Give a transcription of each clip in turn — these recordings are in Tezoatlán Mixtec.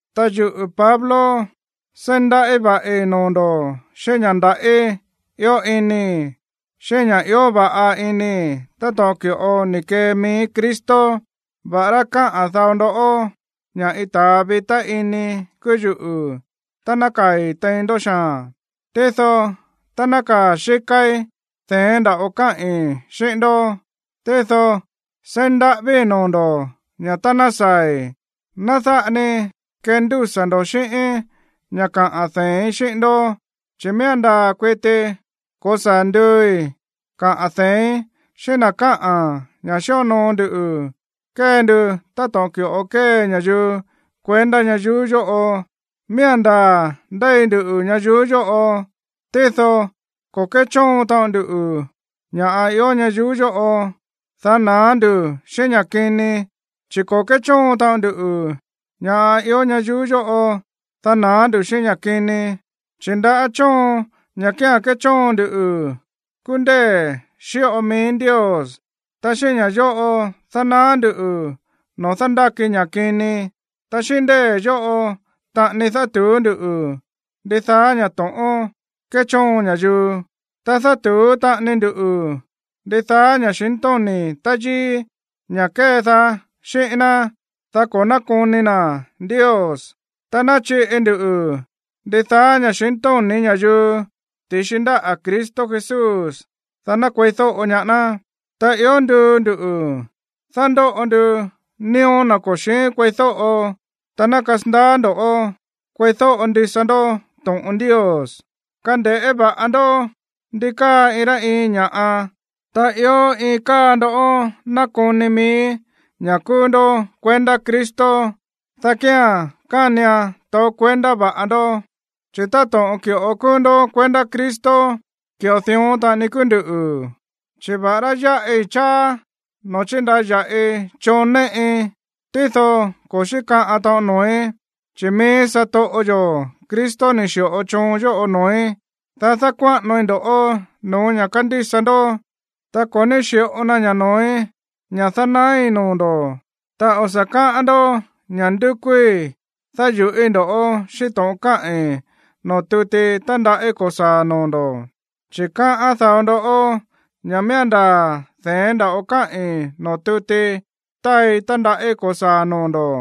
Ta yuꞌu̱ Pablo seí ndaꞌí va̱ꞌi noo̱ ndo̱ xíꞌín ña̱ ndaꞌí ió inii̱, xíꞌín ña̱ ió va̱ꞌa inii̱ táto̱ꞌon ki̱ꞌo ni̱ kee mií Cristo, va̱ꞌará káꞌa̱n dao ndó ña̱ iin ta̱a vitá iní kúú yuꞌu̱ tá nákaa̱i̱ tein ndó xaa̱n, tído tá nákaa̱ xíkáí, de̱én nda̱ꞌo káꞌi̱n xíꞌín ndó. Tído seí ndaꞌávíi̱ noo̱ ndo̱ ña̱ tá ná saa̱i̱, ná dáꞌa ni kendúsa̱ ndo̱ xíꞌíín ña̱ kaꞌa̱n dee̱ín xíꞌín ndó, chi̱ miía̱n ndaa̱ kuiti ko̱saa̱ nduui̱ kaꞌa̱n dee̱ín xíꞌín na̱ káꞌa̱n ña̱ xíonoo ndu kée ndu táto̱ꞌon ki̱ꞌo kée ña̱yuu kuendá ñayuú yóꞌo. Miía̱n ndaa̱ ndéi ndu ñayuú yóꞌo, tído ko̱ kéchóon taꞌon ndu ña̱ꞌa ió ñayuú yóꞌo, dá na̱á ndu̱ xíꞌín ña̱ kini. Chi̱ ko̱ kéchóon taꞌon ndu ña̱ ió ñayuú yóꞌo, dá na̱á ndu̱ xíꞌín ña̱ kini. Chi̱ ndaꞌá chóon, ña̱ kía̱n kéchóon ndu, kúú ndée̱ xíꞌo mií Ndios. Ta xíꞌín ña̱ yóꞌo dánaá ndu̱ noo̱ dándáki ña̱ kini. Ta xíꞌín ndée̱ yóꞌo taꞌani dátu̱ú ndú ndidaa ña̱ to̱ꞌón kéchóon ña̱yuu. Ta dátu̱ú taꞌani ndu ndidaá ña̱xintóni̱ táyíí, ña̱ kédaá xíꞌín ná, dá ko̱ nákoni na̱ Ndios. Ta náchiꞌi ndu ndidaá ña̱xintóni̱ ña̱yuu ti̱xi ndáꞌa̱ Cristo Jesús, dá ná kueídóꞌo ñaá ná. Ta ió nduu ndu̱ dándóꞌo ndu nío̱ na̱ ko̱ xi̱ín kueídóꞌo tá ná kasandaá ndo̱ kueídóꞌo ndisa ndó to̱ꞌon Ndios. Kande̱ꞌé va̱ꞌa ndó ndi káa iin rá iin ña̱ꞌa. Tá ió iin káa ndó nákoni mií ña̱ kúú ndó kuendá Cristo, dá kía̱n kánian taó kuendá va̱ꞌa ndó, chi̱ táto̱ꞌon ki̱ꞌo kúú ndó kuendá Cristo, ki̱ꞌo dión taꞌani kúú nduꞌu̱. Chi̱ va̱ꞌará yáꞌi cháá noo̱ chíndaya̱ꞌii choon néꞌi, tído ko̱ xíkaꞌan taꞌon noo̱í, chi̱ mií satoꞌo yo̱ Cristo ni̱ xi̱ꞌo choon yóꞌo noo̱í, dá dákuáꞌanoi ndo̱ꞌó no̱ó ña̱ kándísa ndó. Ta ko̱ ní xi̱ꞌo na ña̱ noo̱í ña̱ dánaái̱ noo̱ ndo̱. Ta o̱ sa̱ káꞌán ndó ña̱ ndúkúí dáyu̱ꞌíi̱ ndo̱ꞌó xíꞌín to̱ꞌon káꞌi̱n noo̱ tuti tándaꞌí ko̱saa̱ noo̱ ndo̱. Chi̱ kaá dao ndó ña̱ miía̱n ndaa̱ de̱én nda̱ꞌo káꞌi̱n noo̱ tuti táai tándaꞌí ko̱saa̱ noo̱ ndo̱,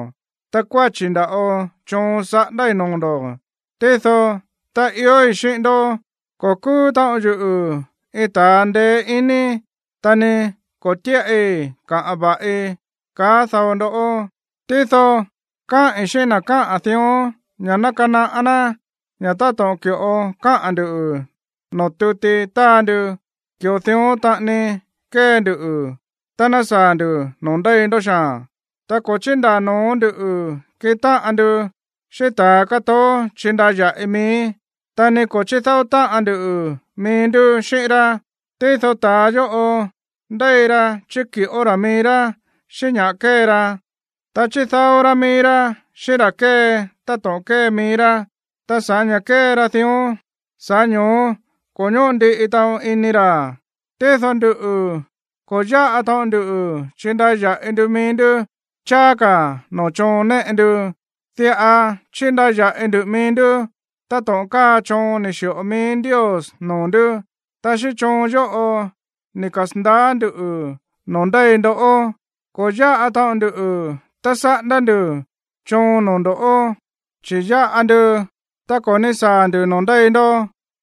ta kuáchi̱ nda̱ꞌo choon saꞌándái̱ noo̱ ndo̱. Tído tá iói̱ xíꞌín ndó, ko̱ kúú taꞌon yuꞌu̱ iin ta̱a ndeé iní, ta ni ko̱ tíꞌai kaꞌa̱n va̱ꞌi, kaá dao ndó. Tído káꞌi̱n xíꞌín na̱ káꞌa̱n dión ña̱ ná kanaꞌá ná ña̱ táto̱ꞌon ki̱ꞌo káꞌa̱n ndu̱ noo̱ tuti táa ndu, ki̱ꞌo dión taꞌani kee ndu tá ná saa̱ ndu̱ noo̱ ndéi ndó xaa̱n. Ta ko̱ chíndaa̱ no̱ó ndu̱ kiꞌin táꞌan ndu xíꞌín ta̱ kátoó chíndaya̱ꞌi mií, ta ni ko̱ chídáó táꞌan ndu mií ndú xíꞌín rá. Tído ta̱a yóꞌo, ndéi ra chíki̱ꞌó ra̱ mií rá xíꞌín ña̱ kée ra, ta chídáó rá mií rá xíꞌín ra̱ kée táto̱ꞌon kée mií rá. Ta sa̱ꞌá ña̱ kée ra dión, sa̱ꞌá ño̱ó ko̱ ñóꞌo ndiꞌi taꞌon ini ra̱. Tído nduꞌu̱, ko̱ yáꞌa taꞌon ndu chíndaya̱ꞌi ndu mií ndú cháá ka̱ no̱ó choon néꞌe ndu. Diꞌa chíndaya̱ꞌi ndu mií ndú táto̱ꞌon káa choon ni̱ xi̱ꞌo mií Ndios noo̱ ndú, ta xíꞌín choon yóꞌo ni̱ kasa̱ndaá ndu̱ noo̱ ndéi ndó. Ko̱ yáꞌa taꞌon ndu tá saꞌándá ndu̱ choon noo̱ ndo̱, chi̱ yáꞌa ndu tá ko̱ ní saa̱ ndu̱ noo̱ ndéi ndó.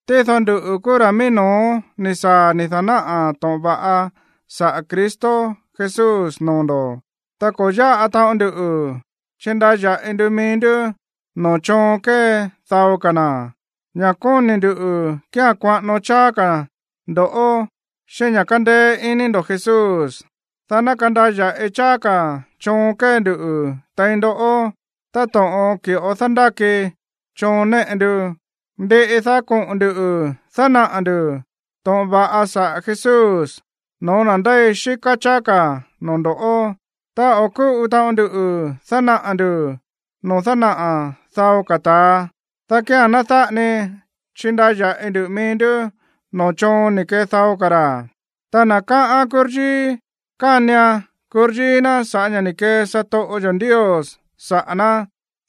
Tído nduꞌu̱ kúú ra̱ mií no̱ó ni̱ saa̱ ni̱ da̱náꞌa̱ to̱ꞌon va̱ꞌa saꞌa̱ Cristo Jesús noo̱ ndo̱. Ta ko̱ yáꞌa taꞌon ndu chíndaya̱ꞌi ndu mií ndú no̱ó choon kée dao ka̱ na̱. Ña̱ kóni̱ ndu̱ kía̱n kuaꞌano cháá ka̱ ndo̱ xíꞌín ña̱ kándéé iní ndo̱ Jesús, dá ná kandaya̱ꞌi cháá ka̱ choon kée ndu tein ndó, táto̱ꞌon ki̱ꞌo dándáki choon néꞌe ndu. Ndiꞌi, dá koꞌo̱n ndu̱ dánaꞌa̱ ndu̱ to̱ꞌon va̱ꞌa saꞌa̱ Jesús no̱ó na̱ ndéi xíká cháá ka̱ noo̱ ndo̱ꞌó, ta o̱ kúꞌu taꞌon ndu dánaꞌa̱ ndu̱ no̱ó dánaꞌa̱ dao ka̱ ta̱a, dá kía̱n ná dáꞌa ni chindaya̱ꞌi ndu mií ndú no̱ó choon ni̱ kee dao ka̱ ra̱. Ta na̱ káꞌán kuryíí, kánian kuryíí ná sa̱ꞌá ña̱ ni̱ kee satoꞌo yo̱ Ndios saꞌa̱ ná.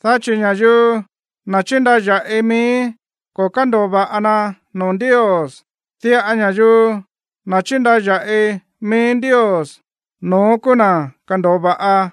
Dá chi̱ ña̱yuu, na̱ chíndaya̱ꞌi mií, ko̱ kándo̱o va̱ꞌa na noo̱ Ndios. Diꞌa ña̱yuu, na̱ chíndaya̱ꞌi mií Ndios, no̱ón kúú na̱ kándo̱o va̱ꞌa.